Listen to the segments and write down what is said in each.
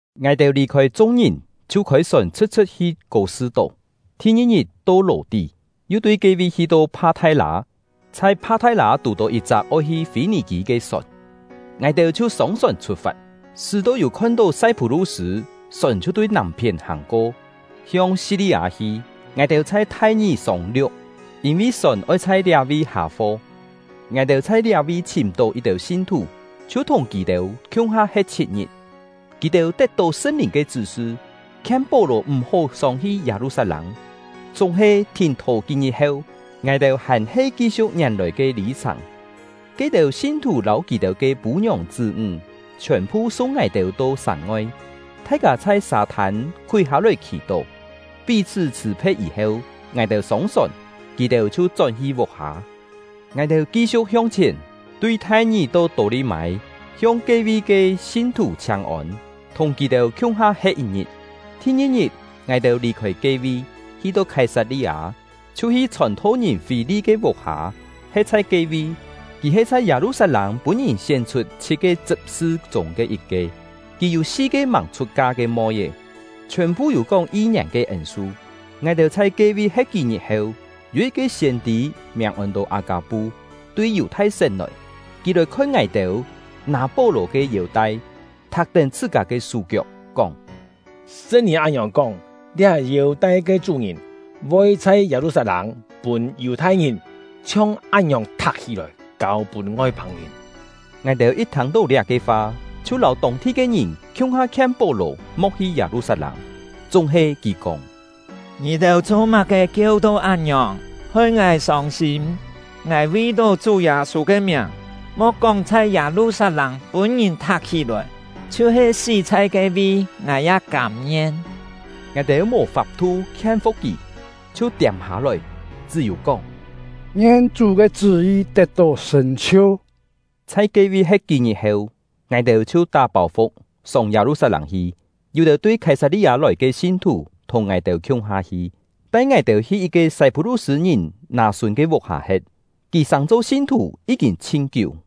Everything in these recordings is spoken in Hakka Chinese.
Ngài-têu lì-khôi chung-ngìn, chhiu khôi-sòn chhṳ̍t-chhṳ̍t hi Kô-sṳ-tó. Thi-ngi-ngit to Lò-tí, yu tui ke-vi hi-to Pha-thai-lâ. Chhai Pha-thai-lâ tù-tó yit-chak oi hi Fî-nì-kî ke sòn, ngài-têu chhiu sông-sòn chhut-fat. Sṳ́-to yû khon-tó Sai-phú-lu-sṳ̂, sòn chhiu tui nàm-phién hàng-ko, hiong Si-li-â hi. Ngài-têu chhai Thai-ngì sông-liu̍k, yîn-vi sòn oi chhai liá-vi hâ-fo. Ngài-têu chhai liá-vi chhìm-tó yit-têu sin-thù, chhiu thùng kì-têu khiung-ha he̍t chhit-ngit. Kì-têu tet-tó Sṳn-Lìn ke chṳ́-sṳ, khien Pó-lò m̀-hó sông-hi Yâ-lu-sat-lâng. Chúng-he, thìn-thò kí-ngit heu, ngài-têu hàn-he ki-siu̍k ngièn-lòi ke lî-chhàng. Ke-têu sin-thù lâu kì-têu ke pû-ngiòng chṳ́-ńg chhiòn-phu sung ngài-têu to sàng-ngoi. Thai-kâ chhai sâ-thân khúi hâ-lòi khì-tó. Pí-chhṳ́ chhṳ̀-phe̍t yî-heu, ngài-têu sông-sòn, kì-têu chhiu chón-hi vuk-hâ. Ngài-têu ki-siu̍k hiong chhièn, tui Thai-ngì to Tô-li-mâi, hiong ke-vi ke sin-thù chhiáng-ôn, thùng kì-têu khiung-ha he̍t yit-ngit. Thi-ngi-ngit, ngài-têu lì-khôi ke-vi, hi-to Khái-sat-li-â, chhiu hi chhòn-tho-ngìn Fî-li ke vuk-hâ, he̍t chhai ke-vi. Kì he chhai Yâ-lu-sat-lâng pûn-ngìn sién-chhut chhit-ke chṳp-sṳ chûng ke yit-ke. Kì yû si-ke màng chhut-ka ke moi-é, chhiòn-phu yû kóng yi-ngièn ke ên-su. Ngài-têu chhai ke-vi he̍t kí-ngit heu, yû yit-ke siên-tî miàng ôn-to Â-kâ-pu, tui Yù-thai-sén lòi. Kì lòi khon ngài-têu, nâ Pó-lò ke yêu-tai, thak-tén chhṳ-kâ ke sú-kiok, kóng: “Sṳn-Lìn án-ngiòng kóng: ‘Liá yêu-tai ke chú-ngìn voi chhai Yâ-lu-sat-lâng pûn Yù-thai-ngìn chhiong án-ngiòng thak-hí-lòi, kâu-pûn Ngoi-pâng-ngìn.’” Ngài-têu yit thâng-tó liá-ke fa, chhiu lâu tông-thi ke ngìn khiung-ha khien Pó-lò mo̍k hi Yâ-lu-sat-lâng. Chúng-he, kì kóng: “Ngì-têu cho-má-ke kieu-to án-ngiòng, hoi ngài sông-sîm? Ngài vi-tó Chú Yâ-sû ke miàng, mo̍k kóng chhai Yâ-lu-sat-lâng pûn-ngìn thak-hí-lòi, chhiu-he sí chhai ke-vi, ngài ya kâm-ngien.” Ngài-têu mò fap-thu khien-fu̍k kì, chhiu tiâm-hâ-lòi, chṳ́-yû kóng: “Ngien Chú ke chṳ́-yi tet-tó sṳ̀n-chhiu.” Chhai ke-vi he̍t kí-ngit heu, ngài-têu chhiu tá pâu-fu̍k, sông Yâ-lu-sat-lâng hi. Yû-têu tui Khái-sat-li-â lòi ke sin-thù thùng ngài-têu khiung-ha hi, tai ngài-têu hi yit-ke Sai-phú-lu-sṳ̂-ngìn Nâ-sûn ke vuk-hâ he̍t; kì sàng-cho sin-thù yí-kîn chhin kiú.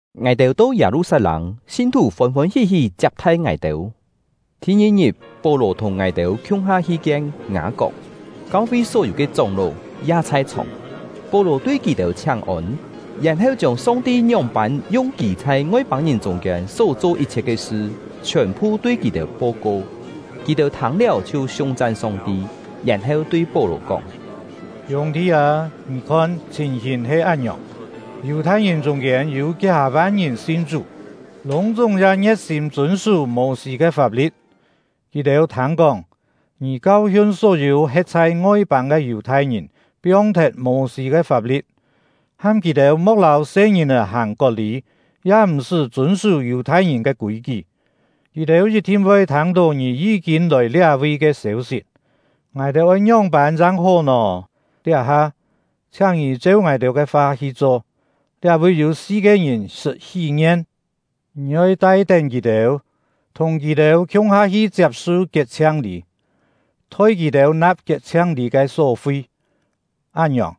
Ngài-têu to Yâ-lu-sat-lâng, sin-thù fôn-fôn hí-hí chiap-thai ngài-têu. Thi-ngi-ngit, Pó-lò thùng ngài-têu khiung-ha hi kien Ngâ-kok; kau-fi só-yû ke chóng-ló ya chhai-chhòng. Pó-lò tui kì-têu chhiáng-ôn, yèn-heu chiông Song-ti ngióng-pân yung kì chhai Ngoi-pâng-ngìn chûng-kiên só-cho yit-chhiet ke sṳ chhiòn-phu tui kì-têu po-ko. Kì-têu thâng-liáu chhiu siung-chan Song-ti, yèn-heu tui Pó-lò kóng: “Hiûng-thi â, ngì khon, chhìn-hìn he án-ngiòng: Yù-thai-ngìn chûng-kiên yû kí-hâ-van ngìn sin Chú, lûng-chúng ya ngie̍t-sîm chûn-sú Mô-sî ke fap-li̍t. Kì-têu thâng-kóng, ngì kau-hiun só-yû he̍t chhai ngoi-pâng ke Yù-thai-ngìn piong-thet Mô-sî ke fap-li̍t, ham kì-têu mo̍k lâu se-ngìn-è hàng kot-lî, ya m̀-sṳ́ chûn-sú Yù-thai-ngìn ke kûi-kí. Kì-têu yit-thin voi thâng-tó ngì yí-kîn lòi liá-vi ke sêu-sit; ngài-têu oi ngióng-pân chang hó nò? Liá-ha, chhiáng ngì cheu ngài-têu ke fa hi cho! Liá-vi yû si-ke ngìn sṳt hí-ngien. Ngì oi tai-tén kì-têu, thùng kì-têu khiung-ha hi chiap-su kiet-chhiang-lî, thoi kì-têu na̍p kiet-chhiang-lî ke só-fi; án-ngiòng,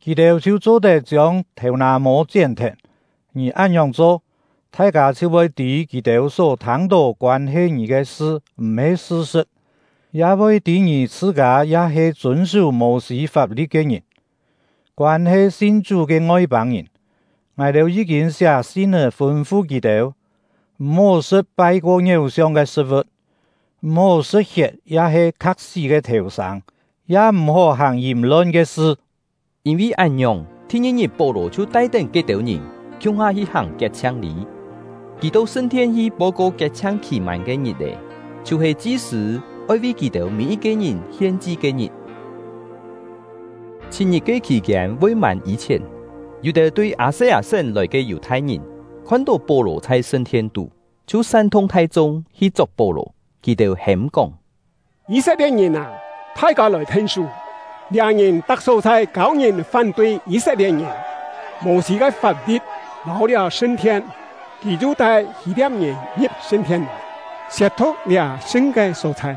kì-têu chhiu cho-tet chiông thèu-nà-mô chién-thet. Ngì án-ngiòng cho, thai-kâ chhiu voi tî kì-têu só thâng-tó koân-he ngì ke sṳ m̀-he sṳ-sṳ̍t, ya voi tî ngì chhṳ-kâ ya he chûn-sú Mô-sî fap-li̍t ke ngìn. Koân-he sin Chú ke Ngoi-pâng-ngìn, ngài-têu yí-kîn siá sin-é fûn-fu kì-têu, m̀-hó sṳ̍t pai-ko ngiéu-siong ke sṳ̍t-vu̍t, m̀-hó sṳ̍t hiet ya-he kha̍k-sí ke thèu-sâng, ya m̀-hó hàng yìm-lon ke sṳ.” Yîn-vi án-ngiòng, thi-ngi-ngit Pó-lò chhiu tai-tén ke-têu ngìn, khiung-ha hi hàng kiet-chhiang-lî. Kì to sṳn-thien hi po-ko kiet-chhiang khì-mân ke ngit-è, chhiu-he chi-sṳ̂ oi vi kì-têu mî-yit-ke ngìn hien-chi ke-ngit. Chhit-ngit ke khì-kiên voi mân yî-chhièn, yû-têu tui Â-se-â-sén lòi ke Yù-thai-ngìn khon-tó Pó-lò chhai sṳn-thien-tú, chhiu san-thung thai-chung hi chok Pó-lò. Kì-têu hêm-kóng: “Yî-set-lie̍t-ngìn â, thai-kâ lòi then-sú! Liá ngìn tak só-chhai kâu ngìn fán-tui Yî-set-lie̍t-ngìn, Mô-sî ke fap-li̍t, lâu liá sṳn-thien. Kì yu tai Hî-lia̍p-ngìn ngi̍p sṳn-thien lòi, siet-thu̍k liá sṳn ke só-chhai!”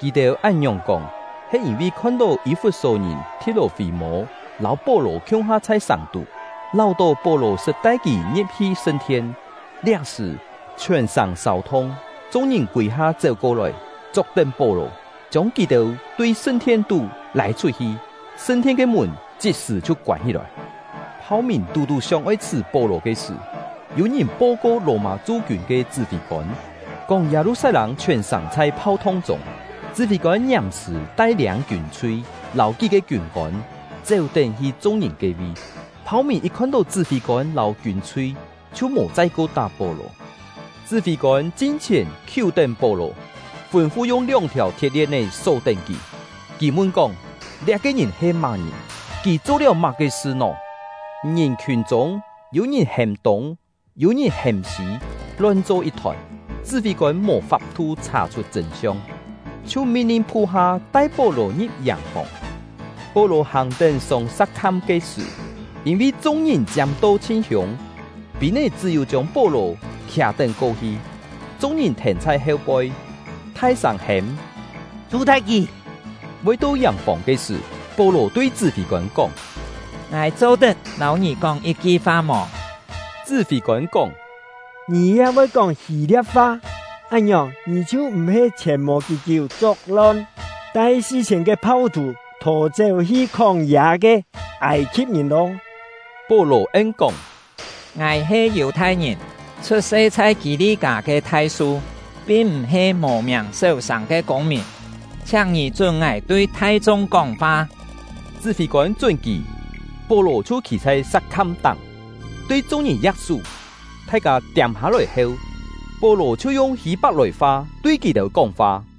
(Kì-têu án-ngiòng kóng, he yîn-vi khon-tó Yî-fut-só-ngìn Thi̍t-lò-fî-mô lâu Pó-lò khiung-ha chhai sàng-tú, láu-tó Pó-lò sṳt tai kì ngi̍p-hi sṳn-thien.) Liá-sṳ̀, chhiòn-sàng sâu-thung, chung-ngìn kûi-ha chéu-ko-lòi, chok-tén Pó-lò, chiông kì tui sṳn-thien-tú lâi chhut-hi; sṳn-thien ke mùn chit-sṳ̀ chhiu koân hí-lòi. Phau-mìn tú-tú sióng-oi chhṳ̀ Pó-lò ke sṳ̀, yû-ngìn po-ko Lò-mâ chu-kiûn ke chṳ́-fî-kôn, kóng Yâ-lu-sat-lâng chhiòn-sàng chhai phau-thung chûng. Chṳ́-fî-kôn ngiàm-sṳ̀ tai-liâng kiûn-chhui lâu kí-ke kiûn-kôn, chéu-tén hi chung-ngìn ke-vi. Phau-mìn yit khon-tó chṳ́-fî-kôn lâu kiûn-chhui, chhiu mò chai-ko tá Pó-lò. Chṳ́-fî-kôn chin-chhièn khiú-tén Pó-lò, fûn-fu yung lióng-thiàu thiet-lien-é só-tén kì. Kì mun-kóng: “Liá-ke ngìn he má-ngìn? Kì cho-liáu má-ke sṳ nò?” Ngìn-khiùn chûng, yû-ngìn hêm tûng, yû-ngìn hêm sî, lon-cho yit-thòn; chṳ́-fî-kôn mò fap-thu chhà-chhut chṳ̂n-siong, chhiu min-lin phu-ha tai Pó-lò ngi̍p yàng-fòng. Pó-lò hàng-tén sông sa̍k-kham ke sṳ̀, yîn-vi chung-ngìn chiâm-to chhin hiûng, pîn-é chṳ́-yû chiông Pó-lò khià-tén ko-hi. Chung-ngìn thèn chhai heu-poi, thai-sâng hêm: “Chhù-thet kì!” Voi to yàng-fòng ke sṳ̀, Pó-lò tui chṳ́-fî-kôn kóng: “Ngài cho-tet lâu ngì kóng yit-ki fa mò?” Chṳ́-fî-kôn kóng: “Ngì ya voi kóng Hî-lia̍p-fa? Án-ngiòng, ngì chhiu m̀-he chhièn mò kí-kiú chok-lon, tai si-chhiên-ke phau-thù thò-chéu hi khóng-yâ ke Âi-khi̍p-ngìn lô?” Pó-lò en-kóng: “Ngài he Yù-thai-ngìn, chhut-se chhai Kî-li-kâ ke Thai-su, pin m̀-he mò miàng séu-sàng ke kûng-mìn. Chhiáng ngì chún ngài tui thai-chung kóng-fa.” Chṳ́-fî-kôn chún kì. Pó-lò chhiu khî chhai sa̍k-kham-táng, tui chung-ngìn ya̍k-sú; thai-kâ tiâm-hâ-lòi heu, Pó-lò chhiu yung Hî-pak-lòi-fa tui kì-têu kóng-fa.